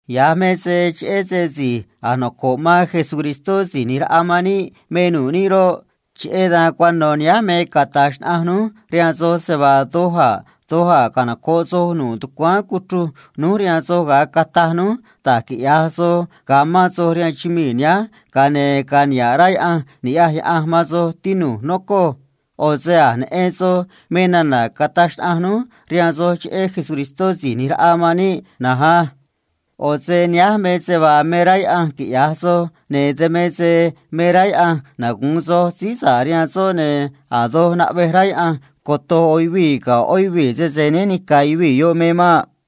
Ya̱j me se cheꞌé se si̱j a̱j noco̱ꞌ man Jesús Si̱j ꞌNi̱j Raꞌa man níꞌ me nu̱ꞌ níꞌ roꞌ, cheꞌé dan cuano̱ nihánj me cata̱j xnaꞌanj núj rihaan soj se vaa doj a̱ doj a̱ canoco̱ꞌ soj nu̱ꞌ tucuáán cuchruj núj rihaan soj ga̱a cataj núj da̱j quiꞌya̱j soj ga̱a mán soj rihaan chumii̱ nihánj ga̱a ne̱ cara̱nꞌ rá Yaꞌanj ni̱ꞌyaj Yaꞌanj man soj, tinu̱j, nocoj. ꞌO̱ se a̱j neꞌen soj me nana̱ cataj xnaꞌanj núj rihaan soj cheꞌé Jesús Si̱j ꞌNi̱j Raꞌa man níꞌ na̱nj á. ꞌO̱ se nihánj me se vaa me rá Yaꞌanj quiꞌya̱j soj, ne̱ dan me se me rá Yaꞌanj cunu̱u sa̱ꞌ nimán soj rihaan soꞌ, ne̱ a̱ doj naꞌvej rá Yaꞌanj coto̱j ꞌo̱ yuvii̱ ga̱ ꞌó yuvii̱ sese né ni̱ca̱ yuvii̱ yoꞌ me maꞌ.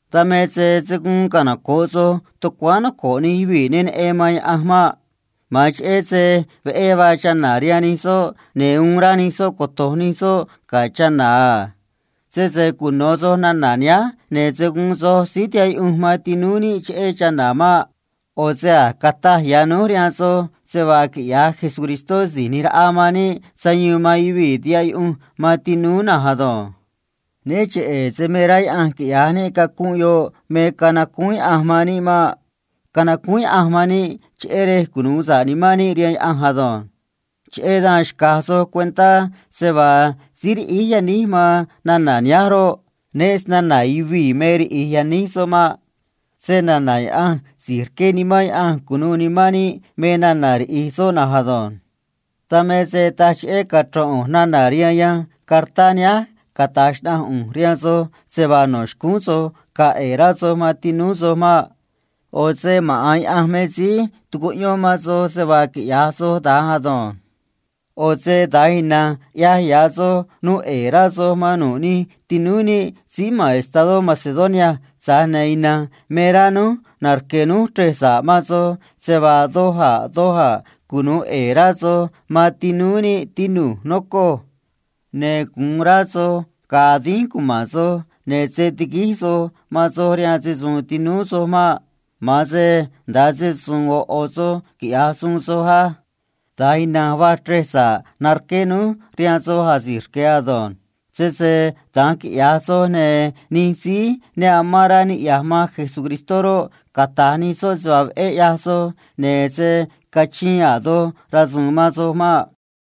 Dan me se se̱ guun canoco̱ꞌ soj tucuáán noco̱ꞌ nij yuvii̱ ne neꞌen man Yaꞌanj maꞌ. Ma̱an cheꞌé se veꞌé vaa chana̱ rihaan nij soꞌ, ne̱ uun rá nij soꞌ coto̱j nij soꞌ ga̱ chana̱ a. Sese cuno̱ soj nana̱ nihánj, ne̱ se̱ guun soj síí tihaꞌ yuꞌunj man tinúú níꞌ cheꞌé chana̱ maꞌ. ꞌO̱ se a̱j cataj ya̱ núj rihaan soj se vaa quiꞌya̱j Síí ꞌNi̱j Raꞌa man níꞌ sayuun man yuvii̱ tihaꞌ yuꞌunj man tinúú na̱nj ado̱nj. Né cheꞌe̱ se me rá Yaꞌanj quiꞌya̱j níꞌ cacunꞌ yoꞌ me canacúún Yaꞌanj man níꞌ maꞌ. Tana̱nj canacúún Yaꞌanj man níꞌ cheꞌé rej cunu̱u sa̱ꞌ nimán níꞌ rihaan soꞌ ado̱nj. Cheꞌé dan xca̱j soj cuentá se vaa síí riꞌíj yaníj man nana̱ nihánj roꞌ, né sna̱na̱ yuvii̱ me riꞌíj yaníj soꞌ maꞌ. Tana̱nj a̱ snana̱ Yaꞌanj si̱j rqué Nimán Yaꞌanj cu̱nuû nimán níꞌ me nana̱ riꞌíj soꞌ na̱nj ado̱nj. Dan me se taj cheꞌé cachro̱n ꞌu̱nj nana̱ rihaan yanj cartá nihánj cata̱j xnaꞌanj ꞌu̱nj rihaan soj se vaa no̱ xcúún soj ga̱a̱ ꞌe̱e̱ rá soj man tinúú soj maꞌ. ꞌO̱ se maꞌa̱n Yaꞌanj me síí tucuꞌyón man soj se vaa quiꞌya̱j soj da̱nj ado̱nj. ꞌO̱ se da̱nj ina̱nj ꞌyaj ya̱ soj nuu ꞌe̱e̱ rá soj man nu̱ꞌ nij tinúú níꞌ síí ma̱n estadó Macedonia, tza̱j ne̱ ina̱nj me rá núj narque̱ núj chrej sa̱ꞌ man soj se vaa doj a̱ doj a̱ cunu̱u ꞌe̱e̱ rá soj man tinúú níꞌ, tinu̱j, nocoj. Ne̱ gu̱un rá soj ga̱a̱ dínj cuma̱n soj, ne̱ se̱ tiguíj soj man soj rihaan se‑su̱u̱n tinúú soj maꞌ. Ma̱an se nda̱a se‑su̱u̱n ꞌo̱ ꞌo̱ soj quiꞌya̱j suun soj á. Da̱nj ina̱nj vaa chrej sa̱ꞌ narqué núj rihaan soj asi̱j rque̱ ado̱nj. Sese da̱nj quiꞌya̱j soj, ne̱ nij síí ne nocoꞌ man Cristó roꞌ, cata̱j nij soꞌ se vaa veꞌé ꞌyaj soj, ne̱ se̱ cachiin a̱ doj rasu̱u̱n man soj maꞌ.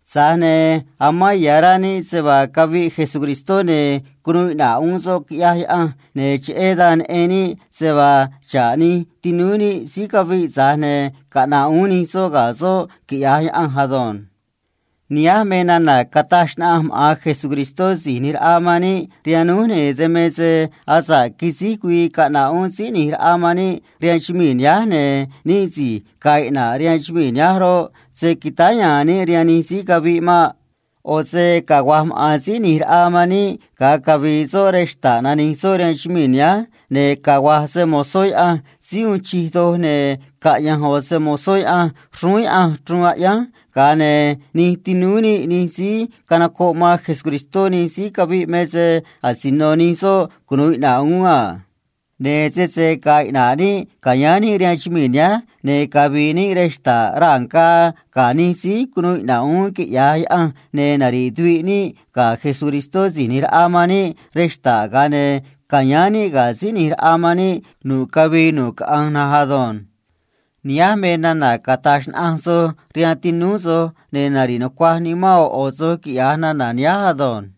Tza̱j ne̱ amán ya̱ rá níꞌ se vaa caviꞌ Jesús, ne̱ cunuu iꞌna̱ꞌ uún soꞌ, quiꞌyaj Yaꞌanj, ne̱ cheꞌé dan neꞌen níꞌ se vaa xa̱ꞌ nij tinúú níꞌ síí caviꞌ, tza̱j ne̱ caꞌna̱ꞌ uún nij soꞌ ga̱ Jesús, quiꞌya̱j Yaꞌanj ado̱nj. Nihánj me nana̱ cataj xnaꞌanj maꞌa̱n Síí ꞌNi̱j Raꞌa man níꞌ rihaan núj, ne̱ dan me se asa̱ꞌ quisíj güii caꞌna̱ꞌ uún Síí ꞌNi̱j Raꞌa man níꞌ rihaan chumii̱ nihánj, ne̱ níꞌ si̱j ga̱a̱ iꞌna̱ꞌ rihaan chumii̱ nihánj roꞌ, se̱ quitáá ya̱a̱n níꞌ rihaan nij síí caviꞌ maꞌ. ꞌO̱ se cagua̱j maꞌa̱n Síí ꞌNi̱j Raꞌa man níꞌ ga̱a cavi̱i̱ soꞌ rej xta̱ꞌ nani̱j soꞌ rihaan chumii̱ nihánj, ne̱ cagua̱j se‑mo̱zó Yaꞌanj síí uun chij doj, ne̱ caꞌya̱nj ꞌo̱ se‑mo̱zó Yaꞌanj xrúún Yaꞌanj chruun aꞌyánj, ga̱a ne̱ nij tinúú níꞌ nij síí canocoꞌ man Cristó nij síí caviꞌ me se asino nij soꞌ cunu̱u iꞌna̱ꞌ uún a. Ne̱ sese ga̱a̱ iꞌna̱ꞌ níꞌ ca̱yáán níꞌ rihaan chumii̱ nihánj, ne̱ cavi̱i̱ níꞌ rej xta̱ꞌ raa̱ ngaa ga̱ nij síí cunuu iꞌna̱ꞌ uún, quiꞌya̱j Yaꞌanj, ne̱ nari̱ꞌ tuviꞌ níꞌ ga̱ Síí ꞌNi̱j Raꞌa man níꞌ rej xta̱ꞌ, ga̱a ne̱ ca̱yáán níꞌ ga̱ Síí ꞌNi̱j Raꞌa man níꞌ nu̱ꞌ cavii nu̱ꞌ caꞌanj na̱nj ado̱nj. Nihánj me nana̱ cata̱j xnaꞌanj soj rihaan tinúú soj, ne̱ nari̱ꞌ nucuaj nimán ꞌo̱ ꞌo̱ soj, quiꞌya̱j nana̱ nihánj ado̱nj.